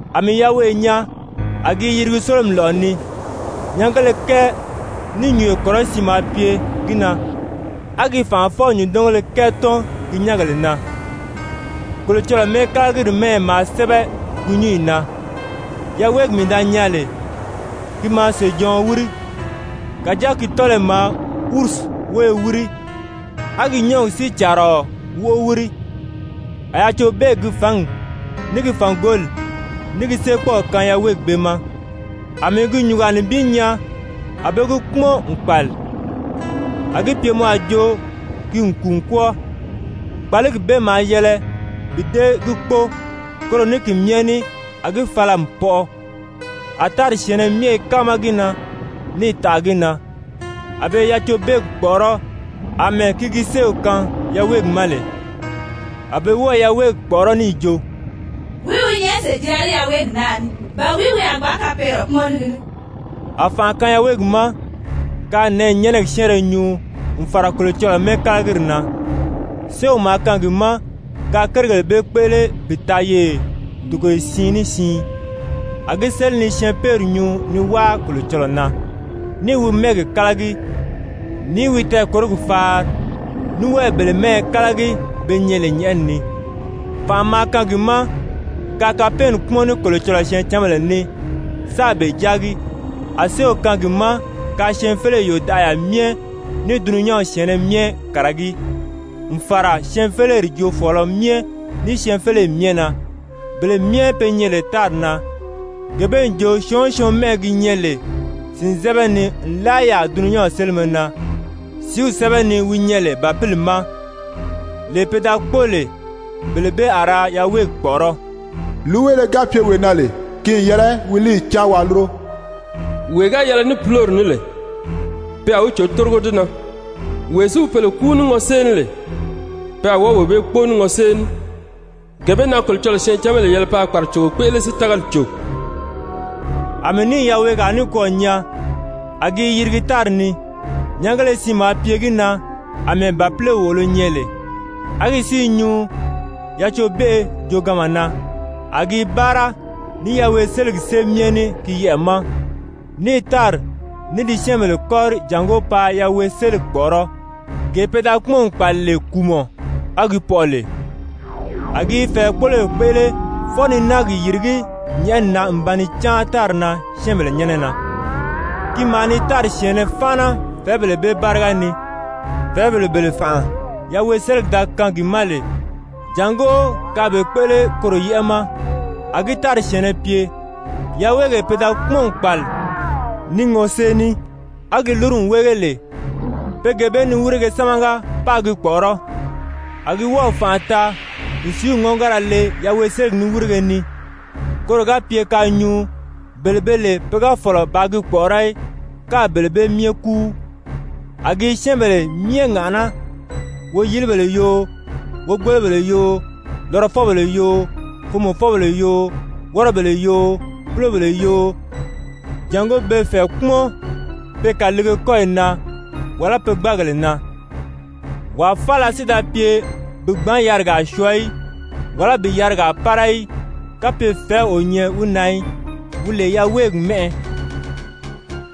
A mii yaweʔe nyaa, a gi i yirigi sólomi lɔ̀ʔɔ ni, nyɛngéle kɛɛ ní nyùnyo kɔrɔsiin maa pye gi na, á gi fànʔafɔ-nyùndɔngéle kɛɛ tɔ́n gi nyɛ́ngèle na, Kolocɔlɔɔ mɛ́ɛkalagiri mɛ́ɛyɛ maa sɛ́bɛ gi nyúnyi na. Yaweegi mii da nyaa lè, ki maa sèjɔɔn wíri, kàjáa ki tɔ́lɔyi maa ursi wóyo wíri á gi nyɔ́ɔgi si càaraɔ wóʔo wíri. A yacobeegi gi fǎngi, ní gi fàngoli, ní gi séekpɔɔw kaan yaweegi bee ma. A mii gi nyùngaa nibin nyaa, a be gi kpúmɔn n kpàli, a gi pye mɔ a jo ki n kùu n kwɔ́ɔ, kpàligi bee maa yɛlɛ bi dée gi kpóo, koro ní ki myɛ ní a gi fala n pɔʔɔ. A tári syɛ̀ɛnnɛ myɛ i káama gi na, níì taʔa gi na. A be i Yacobeegi kpɔ̀ʔɔrɔ́ àmɛɛ ki gi séew kaan yaweegi ma lè. A be wɔ́ɔ i yaweegi kpɔ̀ʔɔrɔ́ níì jo: «Wìí wi nyɛ sèjira ní yaweegi naa ní? Ba wìí wi a gbǎn kapɛɛnnɛ kpúmɔn ní gi ní?» A fànʔa kaan yaweegi ma kaa nɛ̀ɛnyɛnɛgi syɛ́ɛnrɛ nyuu n fàra Kolocɔlɔɔ mɛ́ɛkalagiri na. Séew maa kaan gi ma kaa kérigèle bee kpéʔele bi taa yeye togoye siin ní siin. A gi séli ni syɛɛnpeeri nyuu ni wáa Kolocɔlɔɔ na, ní i wi mɛ́ɛgi kálagi, ní i wi tɛɛkòrogi faari, ní wɔ́ɔ i bele mɛ́ɛyɛ kálagi, be nyɛ lè nyɛ̀ʔɛni ni. Fànʔa maa kaan gi ma kaa kapɛɛnni kpúmɔn ní Kolocɔlɔɔ syɛɛncanbèle ní, sáā be jáagi, a séew kaan gi ma kaa syɛɛnfeleyi yòdaʔaya myɛ, ní dulunyanw syɛ̀ɛnnɛ myɛ kàragí, n fàra syɛɛnfeleri joofɔɔlɔ myɛ, ní syɛɛnfeleyi myɛ na. Bele myɛ be nyɛ lè tári na, gee bee n jo syɔɔn o syɔɔn mɛ́ʔɛ gi nyɛ lè sìnzɛbɛ ni nlaa yaà dulunyanw sélimɛ na sìíw sɛ́bɛ ni wi nyɛ lè Bàpili ma, lee pe da kpóo lè, bele bee a ra yaweegi kpɔ̀ʔɔrɔ́. Líiweele ga pye wee na lè, ki n yɛlɛ wi líiyi cáan waa lúro! Wee ga yɛlɛ ní púlori ní lè, pe a wi cò bi tórigo di na. Wee si wi pèle kúu ní ŋɔsée ní lè, pe a wɔ́ɔ wee bee kpóo ní ŋɔsée ní. Gee bee na Kolocɔlɔɔ syɛɛncanbèle yɛlɛ paa kpàracogo kpéʔele si tágali cò. A mii níì yaweegaa nikwɔɔ nyaa, a gi i yirigi tári ni. Nyɛngéle siin maa pye gi na àmɛɛ bàpile wòʔolo nyɛ lè, á gi si i nyuu yacobeʔe jooganma na. A gi i báara ní yaweeseligi sée myɛ ní gi yɛʔɛ̀ ma, ní i tári ní di syɛ́ɛnbèle kɔ́ri jàngó paa yaweeseligi kpɔ̀ʔɔrɔ́, gee pe da kpúmɔn n kpàli lè kùumɔ, á gi pɔʔɔ lè. A gi i fɛ̀ɛkpoloyi kpéʔele fwɔɔ ni náagi yìrigí nyɛ̀ʔɛni na n ba ni cáan tári na syɛ́ɛnbèle nyɛ́nɛ na. Ki maa ni tári syɛ̀ɛnnɛ fáana fɛ̀ɛ́bèle bee báriga ni, fɛ̀ɛ́bèle bele fànʔa yaweeseligi da kaan gi ma lè jàngó kaa be kpéʔele koro yɛ́ʔɛ ma. A gi tári syɛ̀ɛnnɛ pye, yaweegee pe da kpúmɔn n kpàli ní ŋɔsée ní á gi lúru n wéege lè, pe gee bee niwirige sámaga paa gi kpɔ̀ʔɔrɔ́. A gi wɔ́ɔ̀ fànʔa taa n sìíw ŋɔ́ngara le yaweeseligi niwirige ni, koro ga pye kaa nyuu, bele be lè pe ga fɔ̀lɔ bàā gi kpɔ̀ʔɔrɔ́ í, káā bele bee myɛ kúu. A gi i syɛ́ɛnbèle myɛ ŋàʔaná, woyilibèle yoo, wogbolobèle yoo, lɔrɔfɔbèle yoo, foomɔfɔbèle yoo, wɔ́rɔbèle yoo, púlobèle yoo, jàngó be fɛ̀ɛ kpúmɔn pe kàliige kɔ́yi na wàlá pe gbáagèle na. Wàa faala si da pye bi gbǎn yarigaa syɔɔ í, wàlá bi yarigaa pára í, kapye fɛ̀ɛ́w o nyɛ wi na í, wi lè yaweegi mɛ́ʔɛ,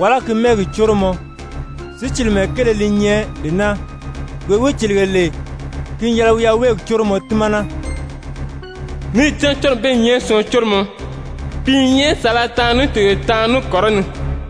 wàlá ki mɛ́ɛgi córomɔ. Sícilimɛ kéele li nyɛ lee naa. Wee wi cìlige lè, ki n yɛlɛ wi yaweegi córomɔ tímana. Níì cán córomi bee i nyɛ syɔɔn córomɔ, pi i nyɛ saala taanri ní togoye taanri ní kɔrɔni.